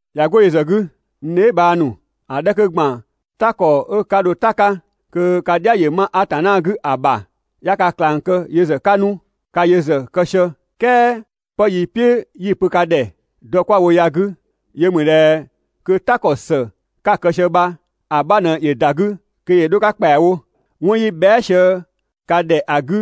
꞊Ya 'go yö ‑zë 'gü, n dheebhang ‑nu, ‑a 'dhɛ 'kö ‑gban "ta ‑kɔ 'ö 'ka dho "ta‑ 'ka kö ka "dhia ‑yö 'ma Atanna 'gü ‑a ‑bha, 'ya ka ꞊klang kë yö ‑zë 'ka 'nu, ka yö ‑zë kë sië, "kɛɛ 'pë 'yi‑ "piʋ̈ 'yi‑ pö ka ‑dhɛ dɔ 'kwa‑ wo ya‑ 'gü, yö mü ꞊dhɛ kö "ta ‑kɔ ‑së 'ka‑ kë sië bha‑ 'bha ꞊në ‑yö ‑da 'gü kö ‑yö 'dho‑ 'ka ‑kpɛawo. 'Wɔn 'yi bhɛa" sië ka ‑dhɛ ‑a 'gü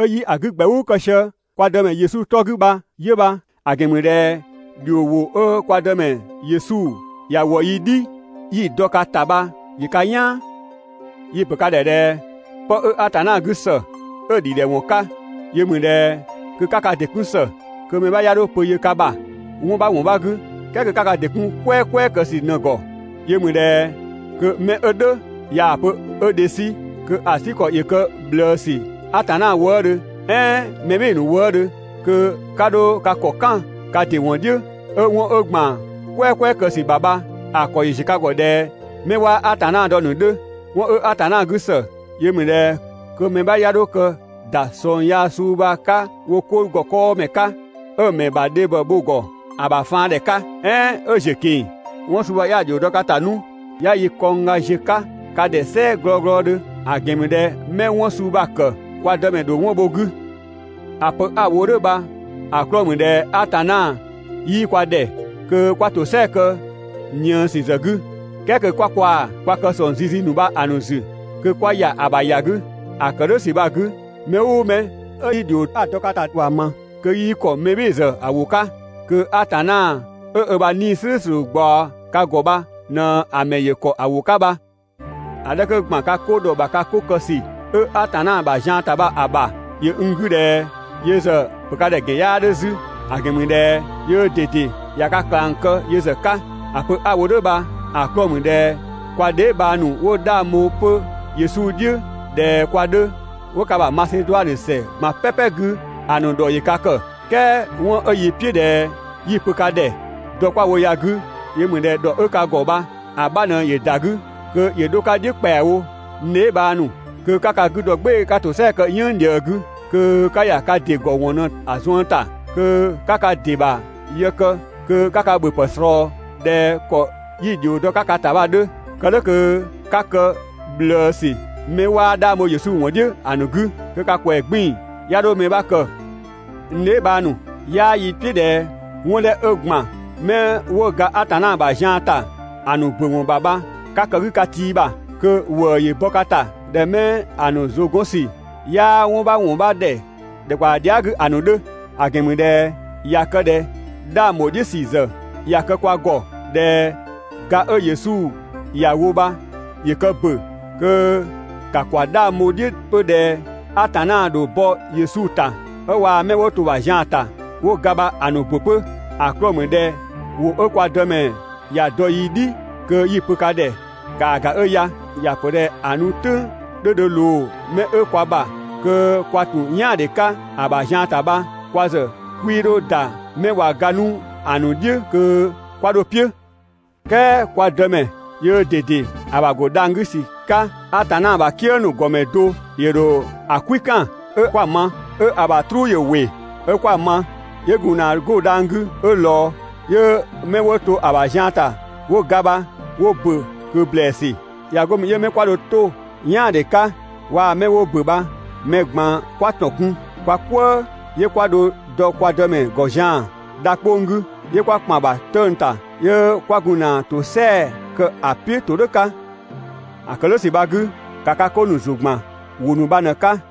'ö 'yi‑ 'gü ‑gbɛʋʋ kë sië kwa Dëmɛ Yesu 'tɔ 'gü bha 'yö bha. ‑A ‑gɛn ‑mü ꞊dhɛ ‑dhio ‑wʋ 'ö kwa Dëmɛ Yesu ‑ya ‑wɔ yi "dhi 'yi‑ dɔ ka ‑ta bha ‑yö ka "yaan. Yi‑ ‑pö ka ‑dhɛ ꞊dhɛ 'pë 'ö Atanna 'gü ‑së, 'ö‑ ‑dhidhɛwɔn 'ka, yö ‑mü ꞊dhɛ kö 'ka ka ‑dɩ 'kun ‑së, kö mɛ 'bha 'ya 'dho pö yö ka ‑bha 'wɔn 'bha ‑wɔn 'bha 'gü, "kɛɛ kö 'ka ka ‑dɩ 'kun "kwɛɛkwɛɛ kë ‑sü ꞊në‑ ‑gɔ. Yö ‑mü ꞊dhɛ kö mɛ 'ö "dhʋ̈ ꞊yaa‑ pö 'ö dhe 'sü, kö‑ 'sü ‑kɔ ‑yö kë ꞊bhlëësü Atanna wëëdhö "ɛɛn mɛ "bhɩɩ‑ ‑nu wëëdhö. kö 'ka 'dho ka ‑kɔ "kan ka ‑dɩ ‑wɔn "dhiʋ̈ 'ö 'wɔn 'ö ‑gban "kwɛɛkwɛɛ kë ‑sü ‑bha bha‑ ‑kɔ ‑yö ‑ziö ka ‑gɔ ꞊dhɛ 'mɛ 'waa Atanna dɔ‑ ‑nu 'dhö. 'Wɔn 'ö Atanna 'gü ‑së, yö ‑mü ꞊dhɛ kö mɛ 'bha 'ya 'dho kë ‑da ꞊sɔng yaa suu bha‑ 'ka wo 'ko ‑gɔ 'kɔɔmɛ 'ka, 'ö‑ ‑mɛ ‑bha dhe bho‑ ‑gɔ ‑a ‑bha faandhɛ 'ka, "ɛɛn 'ö ‑ziö ꞊keng‑. 'Wɔn suu bha 'ya‑ ‑dhio dɔ ka ‑ta 'nu 'ya yi kɔngga ziö‑ 'ka ka ‑dhɛ "sɛɛ glɔglɔdhö. ‑A ‑gɛn ‑mü ꞊dhɛ 'mɛ 'wɔn suu bha‑ ‑kë kwa Dëmɛ ‑dho 'wɔn bho‑ 'gü. ‑A pö 'a‑ wo "dhʋ̈ bha‑ 'klɔɔ‑ ‑mü ꞊dhɛ Atanna 'yii kwa ‑dhɛ kö 'kwa ‑tosɛa kë ꞊niësü ‑zë 'gü, "kɛɛ kö 'kwa kwaa‑ kwa kë ‑sɔng zizi ‑nu bha ꞊në‑ 'zü kö 'kwa ‑ya ‑a ‑bha ‑ya 'gü. ‑A kë "dhʋ̈ ‑sü bha‑ 'gü, mɛ "ʋʋ mɛ 'ö 'yii ‑dhio 'a‑ dɔ ka ‑ta bha‑ ma, kö 'yii ‑kɔ mɛ "bhɩɩ‑ ‑zë ‑wʋ 'ka, kö Atanna 'ö ö ‑bha 'Nii‑ "slʋ̈ʋ̈slʋ̈ ꞊gbaɔ ka ‑gɔ bha ꞊në‑ ‑mɛ ‑yö ‑kɔ ‑wʋ 'ka bha. ‑A 'dhɛ 'kö ‑gban ka 'ko ‑dhɔ ‑bha 'ka 'kö kë ‑sü 'ö Atanna ‑bha zian ‑ta bha‑ ‑bha, ‑yö n 'gü ꞊dhɛ yö ‑zë ‑pö ka ‑dhɛ ‑gɛn 'yaa 'dhö 'zü; ‑a ‑gɛn ‑mü ꞊dhɛ yöö ꞊dede ꞊ya ka ꞊klang kë yö ‑zë 'ka. ‑A pö 'a‑ wo "dhʋ̈ bha‑ 'klɔɔ‑ ‑mü ꞊dhɛ kwa dheebhang ‑nu 'wo 'dhang bho 'pö Yesu "dhiʋ̈ ꞊dhɛ kwa 'dhö, 'wo ka ‑bha Maseduanö ‑sɛ ꞊gban "pɛpɛ 'gü ‑a ‑nu ‑dhɔ ‑yö ka ‑kë. "Kɛɛ 'wɔn 'ö yi "piʋ̈ ꞊dhɛ 'yi‑ pö ka ‑dhɛ dɔ 'kwa‑ wo ya‑ 'gü, yö ‑mü ꞊dhɛ kö ‑dhɔ 'ö ka ‑gɔ bha‑ 'bha ꞊në ‑yö ‑da 'gü kö ‑yö 'dho‑ 'ka "dhiʋ̈ ‑kpɛawo, n dheebhang ‑nu. Kö 'ka ka 'gü dɔ "gbɩɩ‑ 'ka ‑tosɛa kë "yënng ꞊dhië 'gü, kö 'ka ‑ya ka ‑dɩ ‑gɔ ‑wɔn ‑nu ꞊në‑ zuën ‑ta, kö 'ka ka ‑dɩ ‑bha yë kë kö 'ka ka ‑bhöpë ꞊slɔɔ ꞊dhɛ ‑kɔ 'yi‑ ‑dhio dɔ‑ 'ka ka ‑ta bha‑ 'dhö. Kë "dhʋ̈ kö 'ka kë ꞊bhlëësü 'mɛ 'waa 'dhang bho Yesu "dhiʋ̈ ‑a ‑nu 'gü, kö ka ‑kwɛɛ 'gbiin‑ 'ya 'dho mɛ 'bha kë. N dheebhang ‑nu, 'yaa yi "piʋ̈ ꞊dhɛ 'wɔn 'dhɛ 'ö ‑gban 'mɛ 'wo ga Atanna ‑bha zian ‑ta ‑a ‑nu ‑bö ‑wɔn ‑bha bha 'ka kë‑ 'gü ka tii ‑bha, kö ‑wëë ‑yö bɔ ka ‑ta ꞊dhɛ 'mɛ‑ ‑nu ‑zʋ 'gɔn ‑sü 'yaa 'wɔn 'bha ‑wɔn 'bha ‑dhɛ ‑dhɛkpaɔ dhia" 'gü ‑a ‑nu 'dhö. ‑A ‑gɛn ‑mü ꞊dhɛ ꞊ya kë ꞊dhɛ 'dhang ‑bho "dhiʋ̈ ‑sü ‑zë ꞊ya kë kwa ‑gɔ ꞊dhɛ ga 'ö Yesu ‑ya wo bha ‑yö kë ‑bö, kö ‑ka ‑kwa 'dhang bho‑ "dhiʋ̈ 'pö ꞊dhɛ Atanna ‑dho bɔ Yesu ‑ta 'ö waa‑ 'mɛ 'wo to‑ ‑bha zian ‑ta 'wo ga bha‑ ‑nu ‑bö 'pö. ‑A 'klɔɔ‑ ‑mü ꞊dhɛ ‑wʋ 'ö kwa Dëmɛ ‑ya dɔ yi "dhi kö 'yi‑ pö ka ‑dhɛ ‑kaa ‑ga 'ö ya. ‑Ya ‑pö ꞊dhɛ ‑a nu "tʋ̈ng 'dhö dho ꞊loo 'mɛ 'ö kwa ‑bha kö kwa ‑tun "yaandhe 'ka ‑a ‑bha zian ‑ta bha, kwa ‑zë 'kwii 'dho ‑da 'mɛ ꞊wa ga 'nu ‑a ‑nu "dhiʋ̈ kö 'kwa 'dho‑ "piʋ̈. "Kɛɛ kwa Dëmɛ yöö ꞊dede ‑a ‑bha ‑go dhang‑ 'gü ‑sü 'ka, Atanna ‑bha "kië ‑nu ‑gɔmɛ do‑ ‑dho ‑a "kwikan 'ö 'kwa‑ ma, 'ö‑ ‑bha "truu ‑yö ‑wɩ 'ö 'kwa‑ ma, 'yö gun ‑na 'go dhang‑ 'gü 'ö ꞊lɔɔ, 'yö 'mɛ 'wo to‑ ‑bha zian ‑ta 'wo ga bha 'wo ‑bö ꞊kö ‑blɛɛsü. ꞊Ya 'go mü 'yö 'mɛ 'kwa dho 'to "yaandhe 'ka waa 'mɛ 'wo ‑bö bha mɛ ꞊gban 'kwa ‑tɔn kun kwa "kwëë, 'yö 'kwa dho dɔ kwa Dëmɛ ‑gɔ zian‑ dha 'kpong‑ 'gü, 'yö 'kwa ‑kpan ‑bha 'tëng‑ ‑ta, 'yö 'kwa gun ‑na ‑tosɛa kë ‑a "piʋ̈ ‑todhʋ̈ 'ka. ‑A ‑kë "dhʋ̈ ‑sü bha‑ 'gü, ‑ka ka 'ko ‑nu ‑zʋ ‑gban ‑wʋ ‑nu bha ꞊në‑ 'ka.